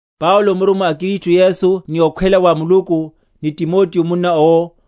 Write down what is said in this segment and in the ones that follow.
Paulo, murummwa a Kristu Yesu ni okhwela wa Muluku, ni Timoteo munna owo,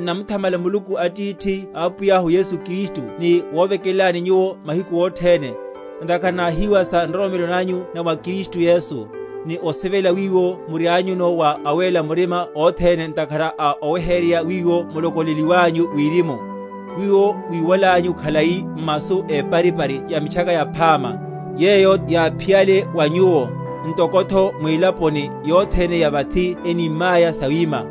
N’namuthamala Muluku Atithi a Apwiyahu Yesu Kristu ni wovekelelani nyuwo mahiku othene, ntakhara náhíwa sa nroromelo nanyu na mwa Kristu Yesu, ni osivela wiwo murianyuno wa awéla murima othene; ntakhara a oweheryerya wiwo mulokolo?-?leliwanyu wirimu, wiwo mwíwalanyu khalai m’masu éparipari ya Mitchaka Yaphama, yeyo yáphiyale wa nyuwo; ntokotho mwilaponi yothene ya vathi enímaya sawima,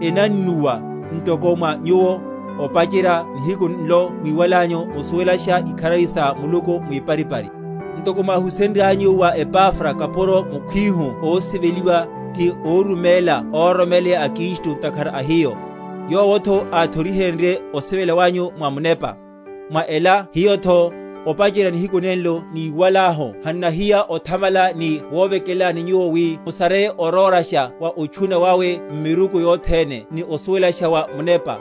enannuwa, ntoko mwa nyuwo, opacherya nihiku nlo mwíwalanyu musuwelasha ikharari sa Muluku mwiparipari; ntoko mwáhusenryanyu wa Epafra kapuro mukhwihu ósiveliwa, ti óruméla óroromeleya a Kristu ntakhara a hiyo; yowotho ánthorihenrye osivela wanyu mwa Munepa. Mwa ela hiyotho, opacherya nihiku nenlo níwalahu hannahiya othamala ni wovekelelani nyuwo wi musareye orórasha wa otchuna wawe m’miruku yothene ni osuwelasha wa munepa,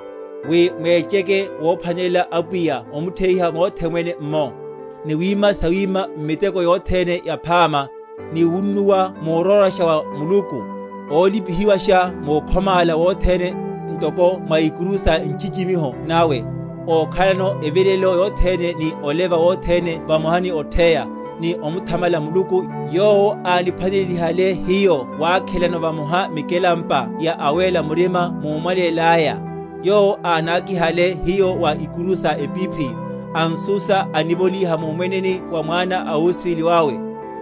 wi mwecheke womphwanelela Apwiya omutheiha mothe mwene’mmo, ni wima sawima m’miteko yothene yaphama, ni wunnuwa murórasha wa Muluku; ólipihiwasha mukhomála wothene, ntoko mwa ikuru sa nchichimiho nawe, ókhalano evilelelo yothene ni oleva wothene vamoha ni otheya, ni omuthamala Muluku, yowo ániphwanelelihale hiyo wakhelano vamoha mikelampa ya awéla murima mumwaleya; yowo ánakihale hiyo wa ikuru sa epiphi; an’susa onivolíha mumwene wa Mwana a osivela wawe;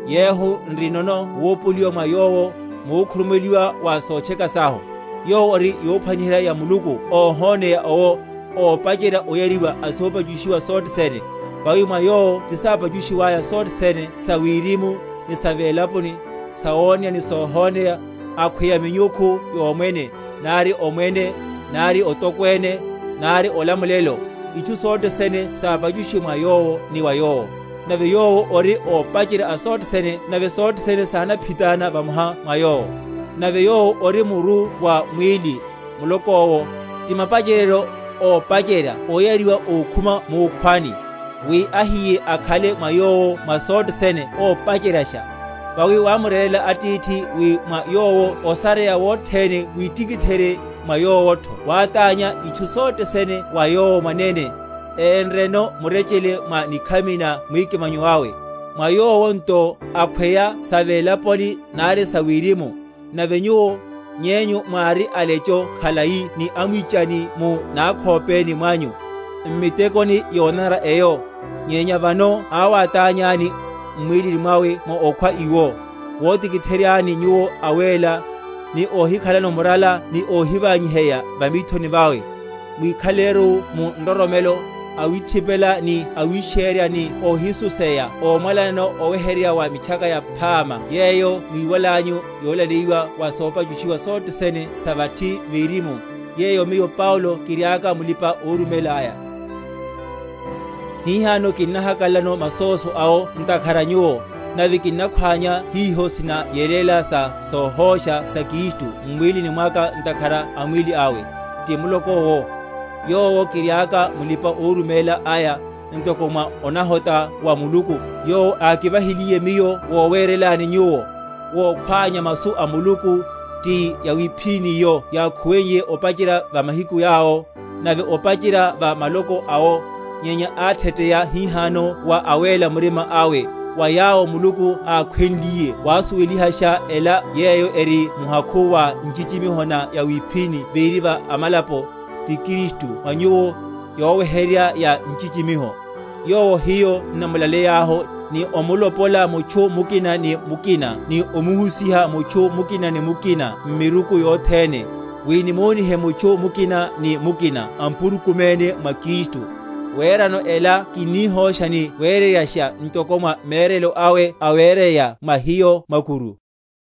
yehu nrinono wopoliwa mwa Yowo, mukhurumuweliwa wa sotcheka sahu; Yowo ori yophwaniherya ya Muluku óhoneya owo, ópacherya oyariwa a sopachushiwa sothe sene; vawi mwa Yowo tisápachushiwaya sothe sene sa wirimu, ni sa velaponi, sawoneya ni sohoneya, akhweya minyukhu yomwene, nari Omwene, nari otokwene, nari olamulelo; itchu sothe sene sápachushiwe mwa Yowo ni wa Yowo. Nave Yowo ori ópacherya a sothe sene nave sothe sene sinaphitána vamoha mwa Yowo. Nave Yowo ori muru wa mwíli, muloko’wo; ti mapacheryeryo, ópacherya oyariwa ókhuma mukhwani; wi ahiye akhale mwa Yowo mwa sothe sene ópacheryasha. Vawi wámurerela Atithi wi mwa Yowo osareya wothene witikitherye, mwa Yowotho wátánya itchu sothe sene wa Yowo mwanene, énreno murechele mwa nikhami na mwikimanyo awe; mwa Yowo nto, akhweya sa velaponi, nari sa wirimu. Nave nyuwo, nyenyu mwári alecho khalai ni amwichani mu nakhopeni mwanyu, m’mitekoni yonanara eyo, nyenya vano awátányani, m’mwílini mwawe mwa okhwa iwo, wotikiTheryani nyuwo awéla, ni óhikhalano murala ni óhiványiheya va mithoni vawe; mwikhalelaru mu nroromelo, awithipela ni awishérya ni óhisuseya ómwalanano oweheryerya wa Mitchaka Yaphama yeyo mwíwalanyu, yolaleyiwa wa sopachushiwa sothe sene sa vathi verimu; yeyo miyo Paulo kiriaka mulipa‐oruméla aya. Omwáchiha wa Paulo múrummwa wawe. Hihano kinnahakalalano masóso awo ntakhara a nyuwo, nave kinnakhwánya hiho sinayeléla sa sohósha sa Kristu m’mwílini mwaka ntakhara a mwíli awe, ti muloko’wo; yowo kiriaka mulipa‐oruméla aya, ntoko mwa onahota wa Muluku yowo ákivahiliye miyo wowerelani nyuwo, wokhwánya masu a Muluku, ti yawiphíníyo yákhuweye opacherya va mahiku yawo, nave opacherya va maloko awo; nyenya átheteya hihano wa awéla murima awe, wa yawo Muluku ákhwenliye wasuwelihasha ela yeyo eri muhakhu wa nchichimiho na yawiphíni véri va amalapo, ti Kristu mwa nyuwo, yoweheryerya ya nchichimiho; yowo hiyo n’namulaleyahu, ni omulopola mutchu mukina ni mukina ni omuhusiha mutchu mukina ni mukina m’miruku yothene, wi nimonihe mutchu mukina ni mukina ampurukuméne mwa Kristu; werano ela kinnihósha ni wereryasha ntoko mwa mérelo awe awereya mwa hiyo mwakuru.